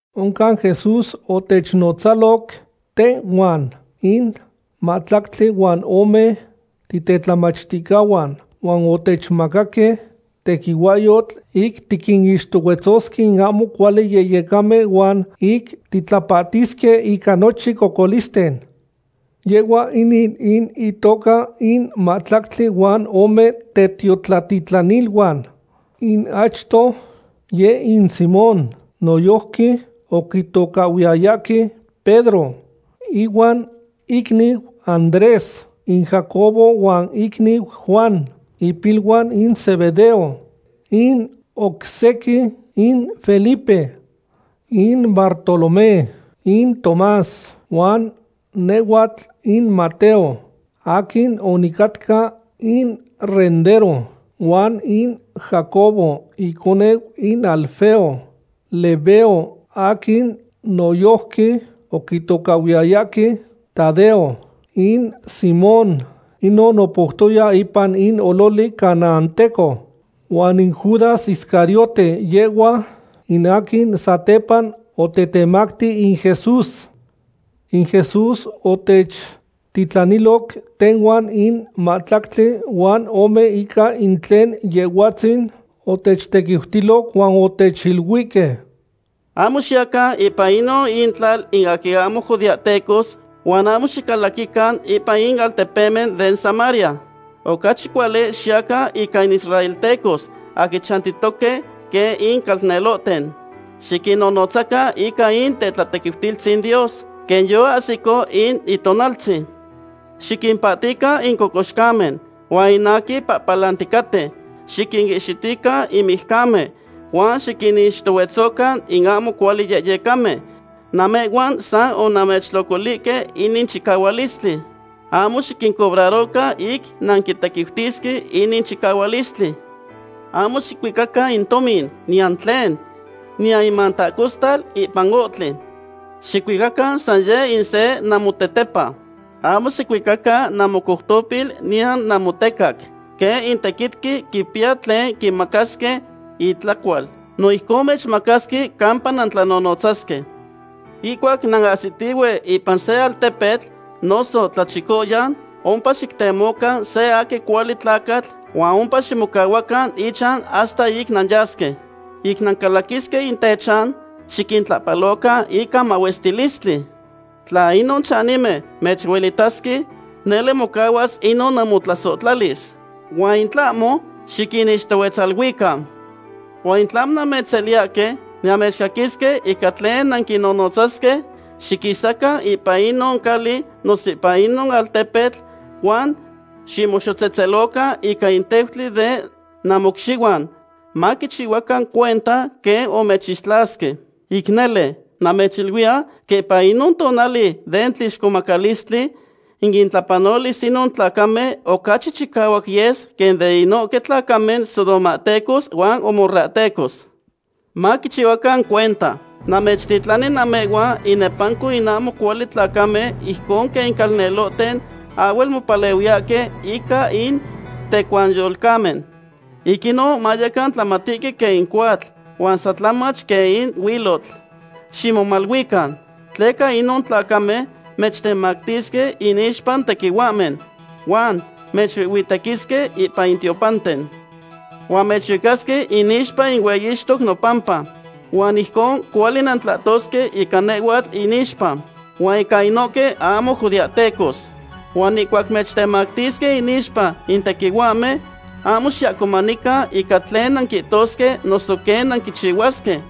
Oncan Jesús otechnotzaloc tehhuan in mahtlactli huan ome titetlamachticahuan huan otechmacaque tequihuahyotl ic tiquinixtohuetzosque in ahmo cuali yehyecamen huan ic titlapahtisque ica nochin cocolisten. Yehhua inin in intoca in mahtlactli huan ome tetiotlatitlaniluan: in achto, yeh in Simón, noyojqui oquitocahhuiyayahque Pedro, ihuan icniu Andrés; in Jacobo huan icniu Juan, ipiluan in Zebedeo; in oc sequin in Felipe, in Bartolomé, in Tomás, huan nehhuatl in Mateo, aquin onicatca in rendero; huan in Jacobo iconeu in Alfeo; Lebeo, aquin noyojqui oquihtocahhuiyayahque Tadeo; in Simón, inon opoutoya ipan in ololi canaanteco; huan in Judas Iscariote, yehhua in aquin satepa otetemacti in Jesús. In Jesús otechtitlaniloc tehhuan in mahtlactli huan ome ica tlen Yehhuatzin otechtequiutiloc huan otechiluihque: ―Ahmo xiyacan ipan inon intlal in aquin ahmo judeahtecos huan ahmo xicalaquican ipan in altepemen den Samaria. Ocachi cuali xiyacan ica in israeltecos aquin chayautoque quen in calnelohten. Xiquinnonotzacan ica in tetlatequiutilistzin Dios, quen yoahsico in itonaltzin. Xiquimpahtican in cocoxcamen, huan in aquin pahpalanticaten. Xiquinihxitican in mijcamen, huan xiquinixtohuetzocan in ahmo cuali yehyecamen. Namehhuan san onamechtlocolihque inin chicahualistli. Ahmo xiquincobrarocan ic nanquitequiutisque inin chicahualistli. ’Ahmo xicuicacan in tomin, niyan tlen, niyan in mantahcostal ipan in ohtli. Xicuicacan san yeh in se namotetepa. Ahmo xicuicacan namocoutopil niyan namotecac. Quen in tequitqui quipiya tlen quimacasque itlacual, no ijcon mechmacasque campa nantlanonotzasque. ’Ihcuac nanahsitihue ipan se altepetl, noso tlachicoyan, ompa xictemocan se aquin cuali tlacatl huan ompa ximocahuacan ichan hasta ic nanyasque. Ic nancalaquisque in techan, xiquintlahpalocan ica mahuestilistli. Tla inon chanimen mechuelitasque, nele mocahuas inon namotlasohtlalis, huan in tlahmo, xiquinixtohuetzaluican. Huan in tlahmo mechseliyahque, niyan mechcaquisque ica tlen nanquinnotzasque, xiquisacan ipan inon cali noso ipan inon altepetl huan ximoxotzetzelocan ica in teutli den namocxihuan, maquichihuacan cuenta quen omechixtlasque. Ic nele, namechiluiya, quen ipan inon tonali den tlixcomacalistli, in itlapanolis inon tlacamen ocachi chicahuac yes quen den inohque tlacamen sodomahtecos huan gomorrahtecos. ’¡Maquichihuacan cuenta! Namechtitlani namehhuan inepanco in ahmo cuali tlacamen ijcon quen in calnelohten ahhuel mopalehuiyahque ica in tecuanyolcamen. Ic inon mayecan tlamatihque quen in cohuatl, huan san tlamach quen in huilotl. Ximomaluican, tleca inon tlacamen mechtemactisque inixpa in tequihuahmen, huan mechuihhuitequisque ipan in tiopanten. Huan mechuicasque inixpa in hueyixtoque nopampa, huan ijcon cuali nantlahtosque ica nehhuatl inixpa, huan ica inohque ahmo judeahtecos. Huan ihcuac mechtemactisque inixpa in tequihuahmen, ahmo xiahcomanican ica tlen nanquihtosque noso quen nanquiniluisque,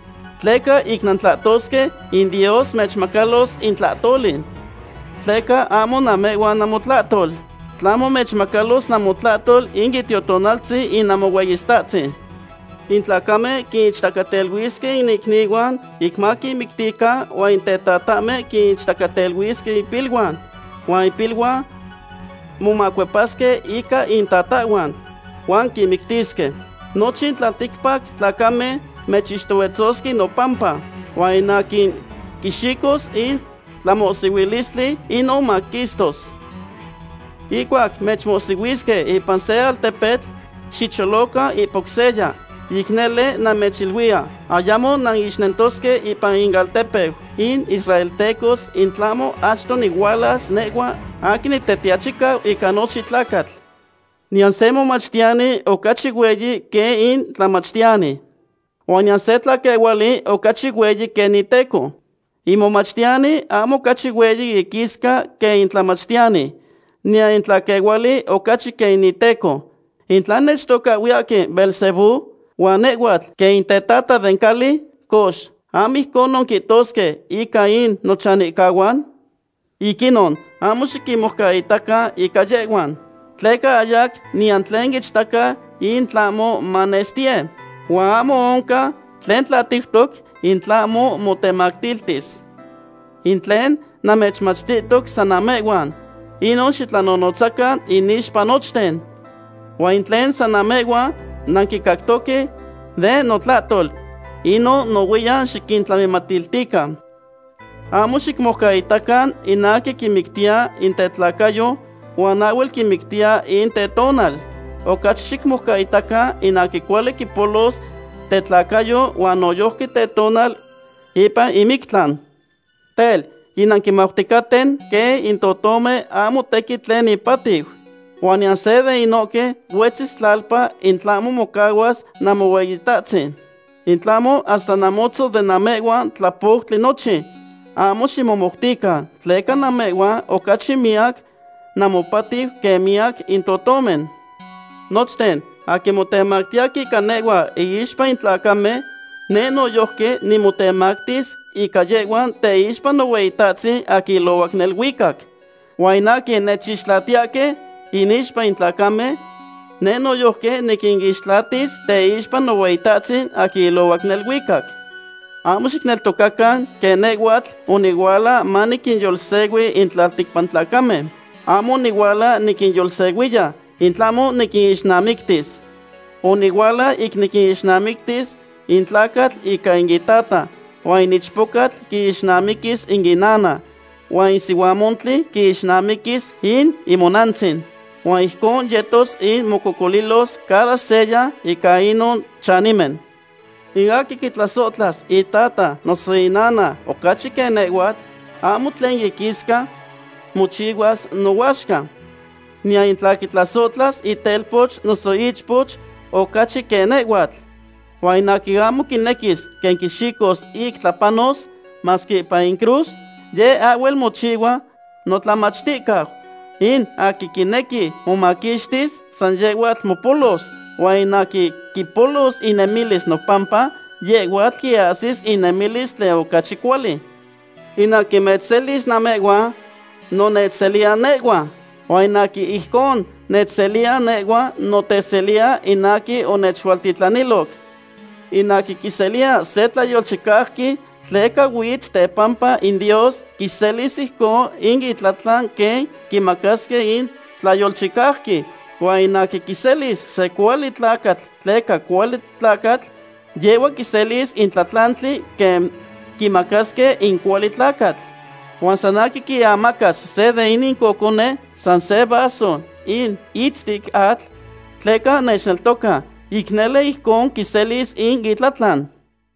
tleca ic nantlahtosque, in Dios mechmacalos in tlahtoli. Tleca ahmo namehhuan namotlahtol, tlahmo mechmacalos namotlahtol in Itiotonaltzin in Namohueyitahtzin. ’In tlacamen quinichtacateluisque in icnihuan ic maquinmictican huan in tetatahmen quinichtacateluisque impiluan, huan impiluan momacuepasque ica intatahhuan, huan quinmictisque. Nochin tlalticpac tlacamen mechixtohuetzosque nopampa, huan in aquin quixicos in tlamohsihuilistli, inon maquistos. Ihcuac mechmohsihuisque ipan se altepetl, xicholocan ipan oc seya. Ic nele namechiluiya, ayamo nantlamiixnentosque ipan inaltepeu in israeltecos in tlahmo achto nihualas nehhua aquin Nitetiachicau ica nochin tlacatl. ’Niyan se momachtiyani ocachi hueyi quen in tlamachtiyani. Huan niyan se tlaquehuali ocachi hueyi quen iteco. In momachtiyani ahmo ocachi hueyi iquisca quen in tlamachtiyani, niyan in tlaquehuali ocachi quen in iteco. In tla nechtocahhuiyahque Beelzebú, huan nehhuatl quen in tetata den cali, cox, ¿ahmo ijcon quihtosque ica in nochanihcahuan? ’Ic inon, ahmo xiquinmoucaitacan ica yehhuan. Tleca ahyac niyan tlen ichtaca in tlahmo manestiye, huan ahmo oncan tlen tlatiutoc in tlahmo motematiltis. In tlen namechmachtihtoc san namehhuan, inon xitlanonotzacan inixpa nochten. Huan in tlen san namehhuan nanquicactoque den notlahtol, inon nohuiyan xiquintlamimatiltican. Ahmo xiquinmoucaitacan in aquin quimictiya in tetlacayo huan ahhuel quimictiya in tetonal. Ocachi xicmoucaitacan in aquin cuali quipolos tetlacayo huan noyojqui tetonal ipan in mictlan. ’Tel, yinanquimauticaten quen in totomen ahmo tequin tlen ipatiu. Huan niyan se de inohque huetzis tlalpa in tlahmo mocahuas Namohueyitahtzin. In tlahmo hasta namotzon de namehhuan tlapoutli nochin. Ahmo ximomoutican, tleca namehhuan ocachi miyac namopatiu quen miyac in totomen. ’Nochten aquin motemactiyahque ica nehhua inixpa in tlacamen, neh noyojqui nimotemactis ica yehhuan teixpa Nohueyitahtzin aquin ilohuac neluicac. Huan in aquin nechixtlatiyahque inixpa in tlacamen, neh noyojqui niquinixtlatis teixpa Nohueyitahtzin aquin ilohuac neluicac. ’Ahmo xicneltocacan quen nehhuatl onihuala maniquinyolsehui in tlalticpac tlacamen. Ahmo onihuala niquinyolsehui; in tlahmo niquinixnamictis. Onihuala ic niquixnamictis in tlacatl ica in itata, huan in ichpochtli quixnamiquis in inana, huan in sihuamontli quixnamiquis in imonantzin. Huan ijcon yetos ic mococolilos cada seya ica inon chanimen. ’In aquin quitlasohtlas itata noso inana ocachi quen nehhuatl, ahmo tlen iquisca mochihuas nohuaxca. Niyan in tla quitlasohtlas itelpoch noso ichpoch ocachi quen nehhuatl. Huan in aquin ahmo quinequis quen quixicos ic tlapanos, masque ipan in cruz, yeh ahhuel mochihua notlamachticau. In aquin quinequi momaquixtis, san yehhuatl mopolos, huan in aquin quipolos inemilis nopampa, yehhuatl quiahsis in inemilis tlen ocachi cuali. ’In aquin mechselis namehhuan no nechseliya nehhua, huan in aquin ijcon nechseliya nehhua no teseliya in aquin onechualtitlaniloc. In aquin quiseliya se tlayolchicauqui tleca huitz tepampa in Dios quiselis ijconon in itlatlan quen quimacasque in tlayolchicauqui. Huan in aquin quiselis se cuali tlacatl tleca cuali tlacatl, yehhua quiselis in tlatlantli quen quimacasque in cuali tlacatl. Huan san aquin quiamacas se de inin cocone san se vaso in itztic atl, tleca nechneltoca, ic nele ijcon quiselis in itlatlan.